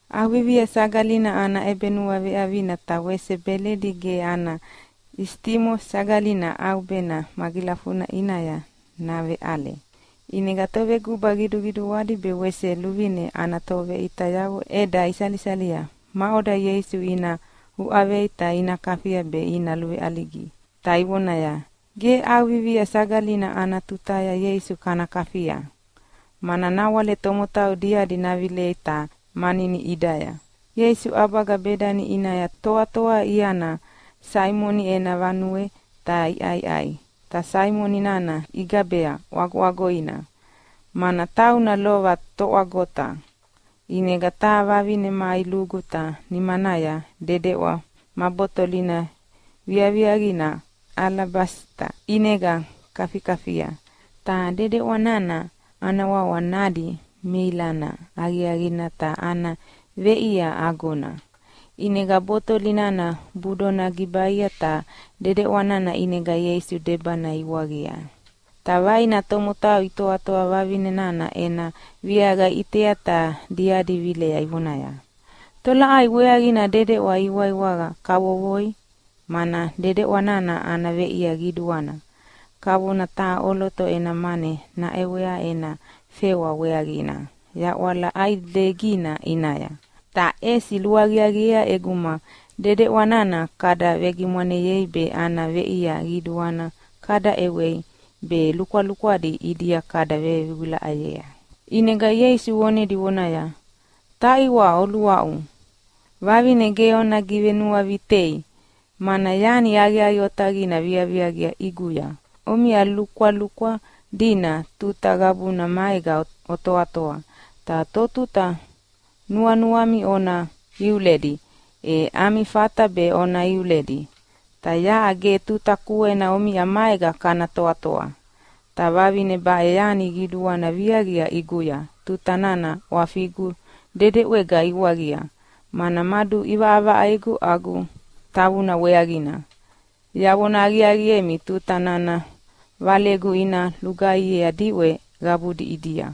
ʼAuvivia Sagalina ana ʼebenuaveʼavina ta wese Beledi ge ana isitimo Sagalina ʼaubena magilafuna ʼinaya naveʼale. ʼInega toveguba qiduqiduadi be wese luvine ana toveʼitayavo ʼeda isalisalia maʼoda Ieisu ina uʼavei ta ina kafia be ina luveʼaligi, ta ivonaya, “Ge ʼAuvivia Sagalina ana tutaya Ieisu kana kafia, mana nawale tomotau diadi navilea ta ina manini ʼidaya.” Ieisu ʼabaga Bedani ʼinaya toatoa iana Saimoni ena vanuea ta iʼaiʼai. Ta Saimoni nana igabea ʼwagoʼwagoina, mana tauna lova toʼwagota. ʼInega taha vavine mai lugu ta nimanaya dedeʼwa ma botolina viaviaqina alabasita ʼinega kafikafia. Ta dedeʼwa nana ana wawa nadi meilana aqiaqina ta ana veʼia agona. ʼInega botoli nana budona gibaia, ta dedeʼwa nana ʼinega Ieisu debana iwaqia. Ta vaina tomotau itoatoa vavine nana ena viaqa iʼitea ta diadi vilea ivonaya, “Tolaʼai weaqina dedeʼwa iwaiwaqa kavokavovoi? Mana dedeʼwa nana ana veʼia qiduana, kavona taha ʼoloto ena mane naʼewea ena fewa weaqina yaʼwala ʼaidegina ʼinaya. Ta ʼesi luaqiaqiea ʼeguma dedeʼwa nana kada vegimwaneyei be ana veʼia qiduana kada ʼewei be lukwalukwadi ʼidia kada vewilaʼayea.” ʼInega Ieisu vonedi vonaya, “Taʼiwa oluaʼu, vavine ge ona givenuavitei mana yani aqiaqi otaqina viaqia ʼiguya. Omiʼa lukwalukwa dina tuta qabuna maega otoatoa, ta totuta nuanuami ona iuledi e ami fata be ona iuledi. Ta yaʼa ge tuta kuena omiʼa maega kana toatoa. Ta vavine baʼe yani qiduana viaqia ʼiguya tuta nana ʼwafigu dedeʼwega iwaqia, mana maduʼivaʼavaʼaigu agu tavuna weaqina. Yavona aqiaqiemi, tuta nana valegu ina lugaihiea diʼwe qabudi ʼidia, e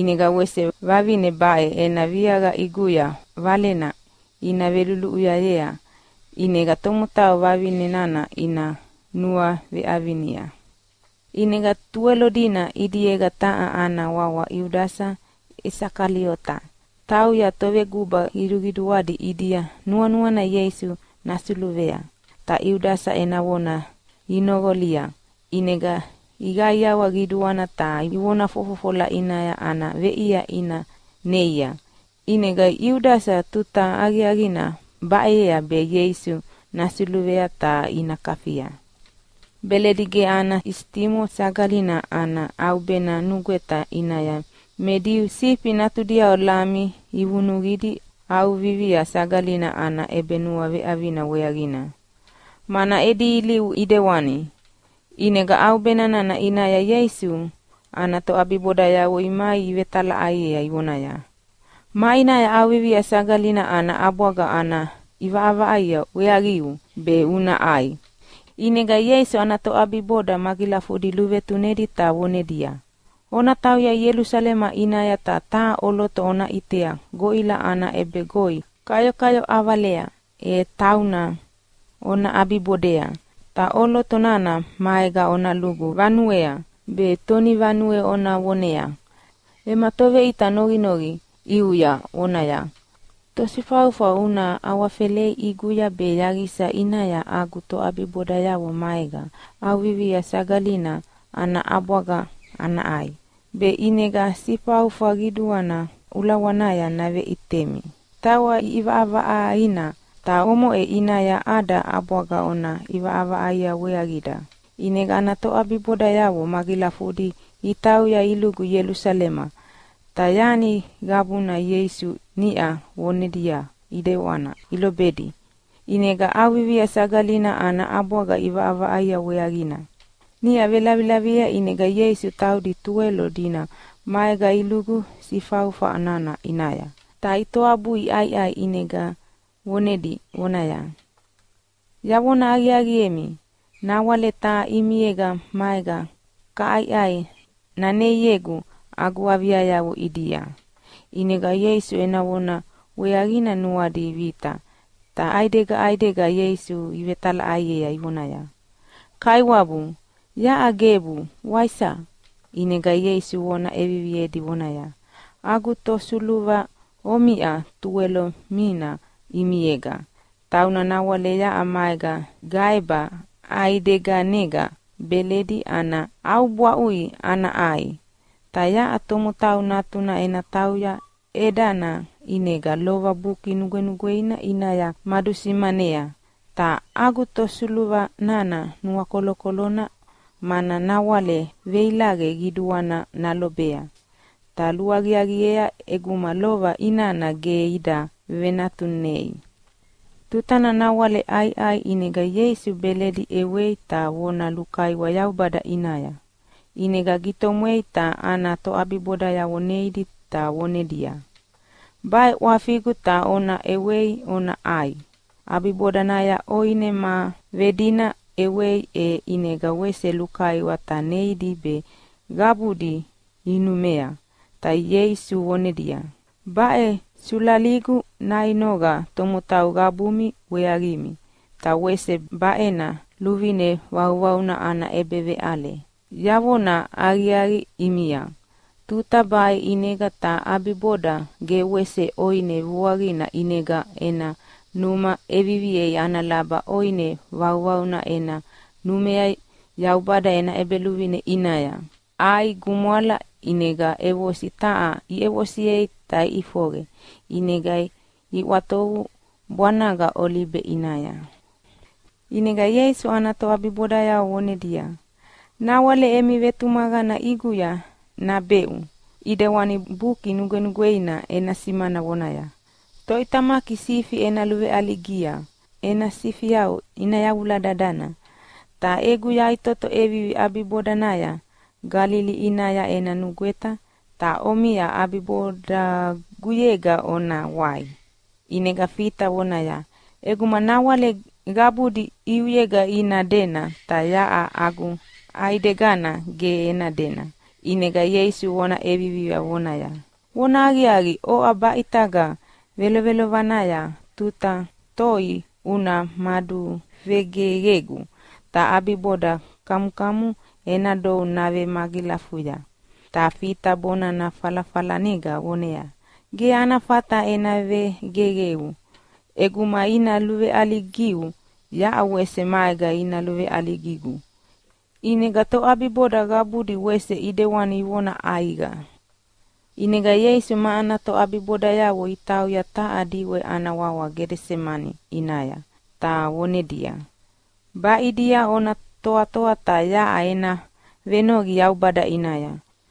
ʼinega wese vavine baʼe ena viaqa ʼiguya valena ina veluluʼuyayea ʼinega tomotau vavine nana ina nuaveʼavinia.” ʼInega Tuwelo dina ʼidiega taha ana wawa Iudasa Isakaliota tauya toveguba qiduqiduadi ʼidia nuanuana Ieisu nasuluvea. Ta Iudasa ena vona inoqolia ʼinega iqaiawa qiduana ta ivona fofofola ʼinaya ana veʼia ina neia. ʼInega Iudasa tuta aqiaqina baʼeyea be Ieisu nasuluvei ta ina kafia. Beledi ge ana isitimo Sagalina ana ʼaubena nugweta ʼinaya me Diu sifi natudiavo lami ivunuqidi ʼAuvivia Sagalina ana ʼebenuaveʼavina weaqina, mana edi ilivu ʼidewana. ʼInega ʼaubena nana ʼinaya Ieisu ana toʼabibodayavo imai ivetalaʼaiea ivonaya, “Maʼinaya ʼAuvivia Sagalina ana ʼabwaga ana ʼivaʼavaʼaia weaqiu be una ʼai?” ʼInega Ieisu ana toʼabiboda magilafudi luvetunedi ta vonedia, “Ona tauya Ielusalema ʼinaya ta taha ʼoloto ona ʼitea goʼila ana ʼebegoi kayokayo ʼavalea, e tauna ona ʼabibodea! Ta ʼoloto nana maega ona lugu vanuea, be tonivanue ona voneaya, ‘Ema Toveʼita noqinoqi ʼiuya vonaya, “Tosifaufa una awafelea ʼiguya be yaqisa ʼinaya agu toʼabibodayavo maega ʼAuvivia Sagalina ana ʼabwaga ana ʼai?” ’ Be ʼinega sifaufa qiduana ulawanaya naveʼitemi tawa ʼiʼivaʼavaʼaina. Ta omoʼe ʼinaya ada ʼabwaga ona ʼivaʼavaʼaia weaqida.” ʼInega ana toʼabibodayavo magilafudi itauya ilugu Ielusalema, ta yani qabuna Ieisu niʼa vonedia ʼidewana ilobedi. ʼInega ʼAuvivia Sagalina ana ʼabwaga iʼivaʼavaʼaia weaqina. Niʼa velavilaviea ʼinega Ieisu taudi Tuwelo dina maega ilugu sifaufa nana ʼinaya. Ta itoabui iʼaiʼai ʼinega vonedi vonaya, “Yavona aqiaqiemi, nawale taha ʼimiega maega kaʼaiʼai naneiegu agu aviayavo ʼidia.” ʼInega Ieisu ena vona weaqina nuadi vita, ta ʼaidega ʼaidega Ieisu ivetalaʼaiea ivonaya, “Kaiwabu, yaʼa gebu, waisa?” ʼInega Ieisu vona ʼeviviedi vonaya, “Agu tosuluva omiʼa Tuwelo mina ʼimiega. Tauna nawale yaʼa maega gaeba ʼaideganega beledi ana ʼaubwaʼui ana ʼai. Ta yaʼa Tomotau Natuna ena tauya ʼedana ʼinega lova Buki Nugwenugweina ʼinaya madusimanea. Ta agu tosuluva nana nuakolokolona, mana nawale veilaqe qiduana nalobea, ta luaqiaqiea ʼeguma lova inana ge ida venatunei.” Tutana nawale iʼaiʼai ʼinega Ieisu beledi ʼewei ta vona lukaiwa Yaubada ʼinaya, ʼinega gitomwei ta ana toʼabibodayavo neidi ta vonedia, “Baʼe ʼwafigu ta ona ʼewei ona ʼai!” ʼAbibodanaya ʼoine ma vedina ʼewei e ʼinega wese lukaiwa ta neidi be qabudi inumea, ta Ieisu vonedia, “Baʼe sulaligu nainoqa tomotau qabumi weaqimi, ta wese baʼena luvine vauvauna ana ʼebeveʼale. Yavona aqiaqi ʼimia, tuta baʼe ʼinega ta ʼabiboda ge wese ʼoine vuaqina ʼinega ena numa ʼeviviei ana laba ʼoine vauvauna ena numea Yaubada ena ʼEbeluvine ʼinaya.” ʼAi gumwala ʼinega ʼevosi taha iʼevosiei ta iʼifoqe, ʼinega iʼwatovu bwanaga Olibe ʼinaya. ʼInega Ieisu ana toʼabibodayavo vonedia, “Nawale emi vetumaqana ʼiguya nabeʼu ʼidewana Buki Nugwenugweina ena simana vonaya, ‘Toʼitamaki sifi ena luveʼaligia ta ena sifiavo ina yavula dadana.’ Ta egu yaʼitoto ʼevivi ʼabibodanaya Galili ʼinaya ena nugweta, ta omiʼa ʼabibodaguyega ona wai.” ʼInega Fita vonaya, “ʼEguma nawale qabudi ʼiuyega ina dena ta yaʼa agu ʼaidegana ge ena dena.” ʼInega Ieisu vona ʼeviviea vonaya, “Vonahaqiaqi, oʼa baʼitaga velovelovanaya tuta toi una maduvegeqegu, ta ʼabiboda kamukamu ena dou navemagilafuya.” Ta Fita bonana falafalanega voneaya, “Ge ana fata ena vegeqeu! ʼEguma ina luveʼaligiu yaʼa wese maega ina luveʼaligigu.” ʼInega toʼabiboda qabudi wese ʼidewani ivona ʼaiqa. ʼInega Ieisu ma ana toʼabibodayavo itauya taha diʼwe ana wawa Gedesemani ʼinaya, ta vonedia, “Baʼidia ona toatoa ta yaʼa ena venoqi Yaubada ʼinaya.”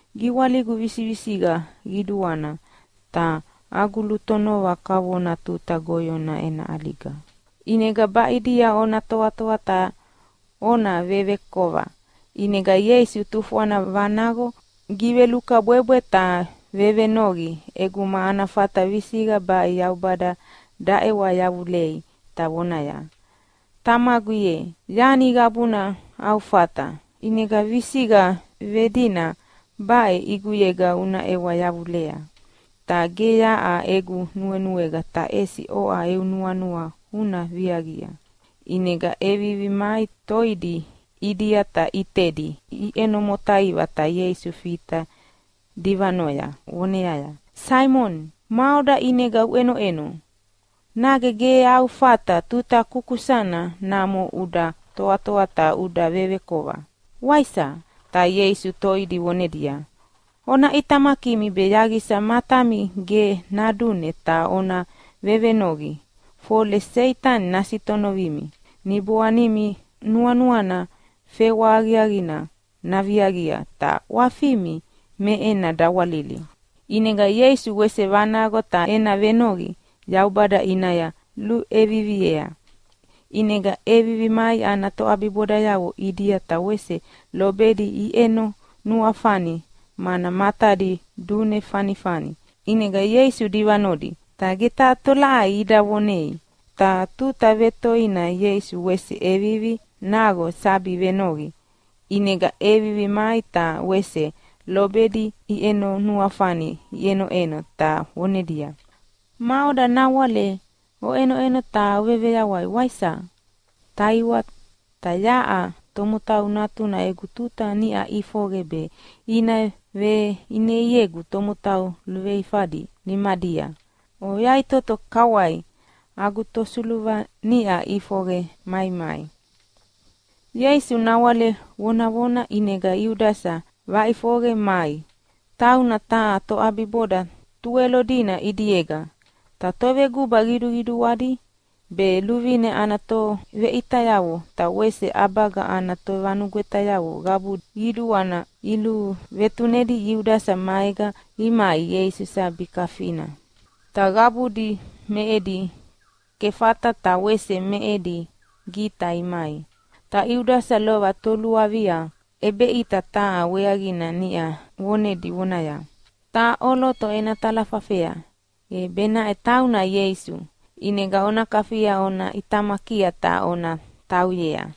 “Giwaligu visivisiqa qiduana, ta agu lutonova kavona tuta goyona ena ʼaliga. ʼInega baʼidia ona toatoa ta ona vevekova.” ʼInega Ieisu tufwana vanaqo givelukabwebwe ta vevenoqi ʼeguma ana fata visiqa baʼe Yaubada daʼewa yavulei ta vonaya, “Tamagu ye, yani qabuna au fata, ʼinega visiqa vedina baʼe ʼiguyega una ʼewa yavulea. Ta ge yaʼa egu nuenuega ta ʼesi oʼa eu nuanua una viaqia.” ʼInega ʼevivi mai toidi ʼidia ta ʼitedi iʼeno motaiva ta Ieisu Fita divanoya voneaya, “Saimoni, maʼoda ʼinega uʼenoʼeno, nage ge au fata tuta kukusana namo uda toatoa ta uda vevekova, waisa?” Ta Ieisu toidi vonedia, “Ona ʼitamakimi be yaqisa matami ge nadune ta ona vevenoqi, fole Seitani nasitonovimi. Niboanimi nuanuana fewa aqiaqina naviaqia, ta ʼwafimi me ena dawalili.” ʼInega Ieisu wese vanaqo ta ena venoqi Yaubada ʼinaya luʼeviviea. ʼInega ʼevivi mai ana toʼabibodayavo ʼidia ta wese lobedi iʼeno nuafani mana matadi dune fanifani. ʼInega Ieisu divanodi, ta ge taha tolaʼai ida vonei. Ta tuta vetoina Ieisu wese ʼevivi naqo sabi venoqi, ʼinega ʼevivi mai ta wese lobedi iʼeno nuafani iʼenoʼeno ta vonedia, “Maʼoda nawale oʼenoʼeno ta oveveyawai, waisa? Taʼiwa, ta yaʼa Tomotau Natuna egu tuta niʼa ʼifoqe be ina veʼineiegu tomotau luveifadi nimadia. Oyaʼitoto kawai, agu tosuluva niʼa ʼifoqe maimai.” Ieisu nawale vonavona ʼinega Iudasa vaʼifoqe mai, tauna taha toʼabiboda Tuwelo dina ʼidiega. Ta toveguba qiduqiduadi be luvine ana toveʼitayavo ta wese ʼabaga ana tovanugwetayavo qabu qiduana iluvetunedi Iudasa maega imai Ieisu sabi kafina. Ta qabudi me edi kefata ta wese me edi gita imai. Ta Iudasa lova toluavia ʼebeʼita taha weaqina niʼa vonedi vonaya, “Taha ʼoloto ena talafafea, e benaʼe tauna Ieisu, ʼinega ona kafia ona ʼitamakia ta ona tauyea.”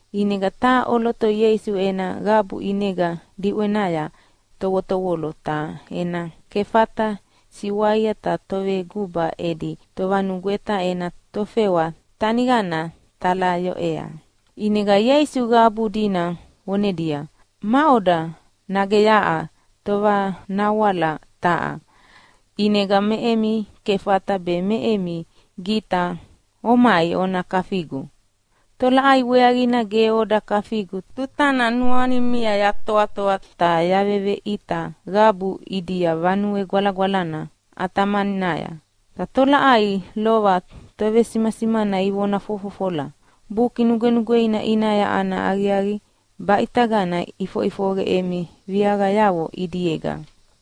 ʼInega taha ʼoloto Ieisu ena qabu ʼinega diʼwenaya tovotovolo ta ena kefata siwaia ta toveguba edi tovanugweta ena tofewa teniqana talayoʼea. ʼInega Ieisu qabu dina vonedia, “Maʼoda, nage yaʼa tovanawala taha, ʼinega me emi kefata be me emi gita omai ona kafigu? Tolaʼai weaqina ge oda kafigu tutana nuanimia yatoatoa ta yaveveʼita qabu ʼidia Vanue Gwalagwalana ʼatamaninaya? Ta tolaʼai lova tovesimasimana ivona fofofolea Buki Nugwenugweina ʼinaya ana aqiaqi baʼitagana ʼifoʼifoqe emi viaqayavo ʼidiega.”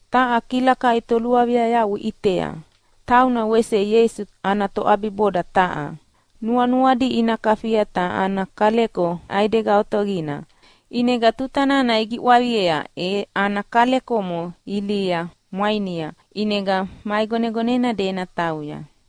Ta taha kilakai toluaviayavo iʼitea, tauna wese Ieisu ana toʼabiboda taha. Nuanuadi ina kafia ta ana kaleko ʼaidega otaqina, ʼinega tuta nana igiʼwaqiea e ana kalekomo ilihi mwainia, ʼinega maʼigonegonena dena tauya.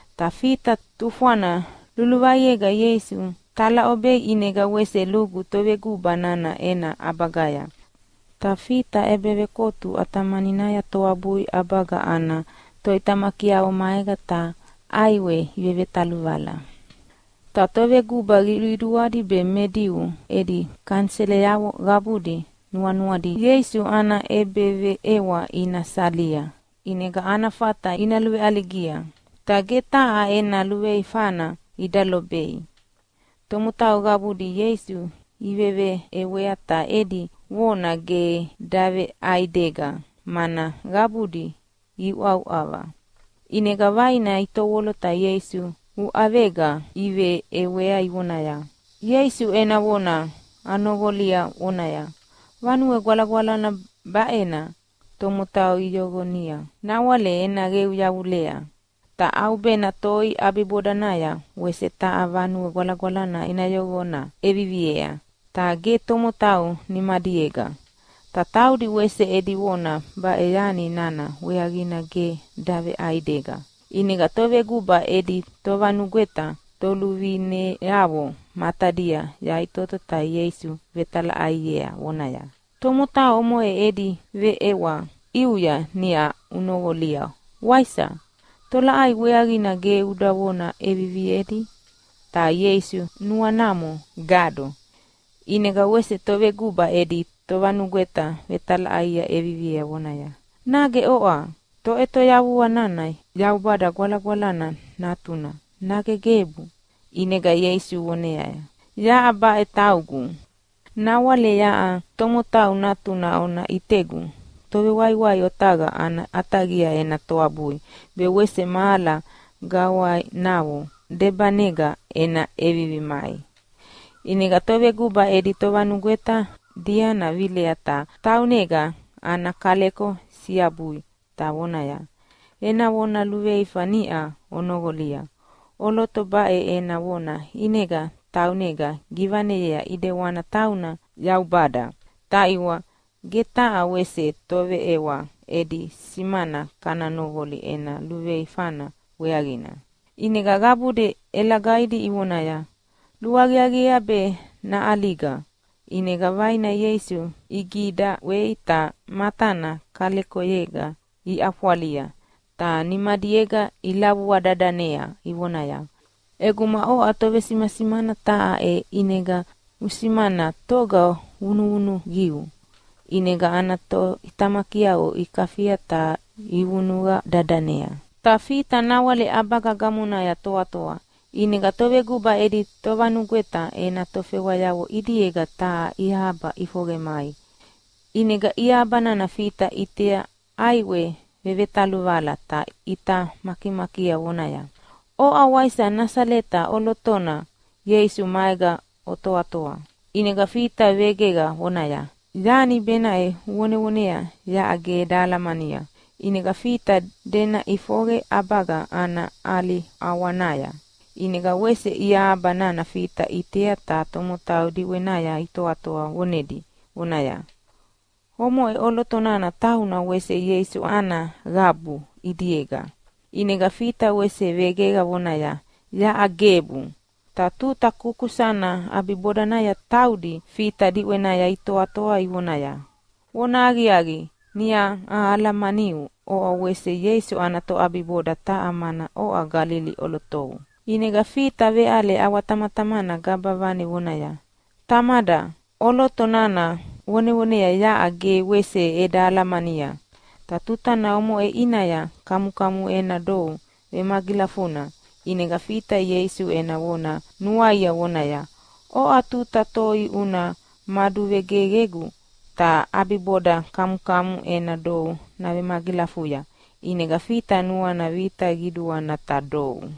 Ta Fita tufwana luluvaiega Ieisu talaʼobea ʼinega wese lugu toveguba nana ena ʼabagaya. Ta Fita ʼebevekotu ʼatamaninaya toabui ʼabaga ana toʼitamakiavo maega ta ʼaiwea ivevetaluvala. Ta toveguba qiduqiduadi be me Diu edi kaniselayavo qabudi nuanuadi Ieisu ana ʼebeveʼewa ina salia ʼinega ana fata ina luveʼaligia, ta ge taha ena luveifana ida lobei. Tomotau qabudi Ieisu iveveʼewea ta edi vona ge daveʼaidega mana qabudi iuʼauʼava. ʼInega vaina itovolo ta Ieisu uʼavega iveʼewea ivonaya, “Ieisu ena vona anoqolia vonaya, ‘Vanue Gwalagwalana baʼena tomotau iyoqonia nawale ena qeu yavulea, ta ʼaubena toi ʼabibodanaya wese taha vanue gwalagwalana ena yoqona ʼeviviea, ta ge tomotau nimadiega.’” Ta taudi wese edi vona baʼe yani nana weaqina ge daveʼaidega. ʼInega toveguba edi tovanugweta toluvineavo matadia yaʼitoto ta Ieisu vetalaʼaiea vonaya, “Tomotau omoʼe edi veʼewa ʼiuya niʼa unoqolia, waisa? Tolaʼai weaqina ge uda vona ʼeviviedi?” Ta Ieisu nuanamo gado. ʼInega wese toveguba edi tovanugweta vetalaʼai ʼeviviea vonaya, “Nage oʼa Toʼetoyavuauna Yaubada Gwalagwalana Natuna, nage gebu?” ʼInega Ieisu voneaya, “Yaʼa baʼe taugu. Nawale yaʼa Tomotau Natuna ona ʼitegu Tovewaiwai Otaqa ana ʼataqia ena toabui be wese mahala gawainavo debanega ena ʼevivi mai.” ʼInega toveguba edi tovanugweta diana vilea ta taunega ana kaleko siabui ta vonaya, “Ena vona luveifa niʼa onoqolia. ʼOloto baʼe ena vona ʼinega taunega givaneyea ʼidewana tauna Yaubada! Taʼiwa, ge taha wese toveʼewa edi simana kana noqoli ena luveifana weaqina.” ʼInega qabudi ʼelagaidi ivonaya, “Luaqiaqiea be naʼaliga!” ʼInega vaina Ieisu igidaʼwei ta matana kalekoyega iʼafwalia ta nimadiega ilavua dadanea ivonaya, “ʼEguma oʼa tovesimasimana taha e ʼinega usimana toga vunuvunuqiu!” ʼInega ana toʼitamakiavo ikafia ta ivunuqa dadanea. Ta Fita nawale ʼabaga gamonaya toatoa, ʼinega toveguba edi tovanugweta ena tofewayavo ʼidiega taha iahaba ʼifoqe mai. ʼInega iahabana Fita ʼitea ʼaiwea vevetaluvala ta ʼita makimakia voneaya, “Oʼa wese Nasaleta ʼolotona Ieisu maega otoatoa.” ʼInega Fita vegeqa vonaya, “Yani benaʼe uvonevonea yaʼa ge eda alamania!” ʼInega Fita dena ʼifoqe ʼabaga ana ʼali ʼawanaya. ʼInega wese iahaba nana Fita ʼitei ta tomotau diʼwenaya itoatoa vonedi vonaya, “Omoʼe ʼoloto nana tauna wese Ieisu ana qabu ʼidiega.” ʼInega Fita wese vegeqa vonaya, “Yaʼa gebu!” Ta tuta kusakusana ʼabibodanaya taudi Fita diʼwenaya itoatoa ivoneaya, “Vonahaqiaqi, niʼa ahalamaniu oʼa wese Ieisu ana toʼabiboda taha mana oʼa Galili ʼolotou!” ʼInega Fita veʼale ʼawatamatamana gaba vane vonaya, “Tamada, ʼoloto nana ovonevonea yaʼa ge wese eda alamania!” Ta tuta omoʼe ʼinaya kamukamu ena dou vemagilafuna. ʼInega Fita Ieisu ena vona nuaia vonaya, “Oʼa tuta toi una maduvegeqegu ta ʼabiboda kamukamu ena dou navemagilafuya.” ʼInega Fita nuana vita qiduana ta dou.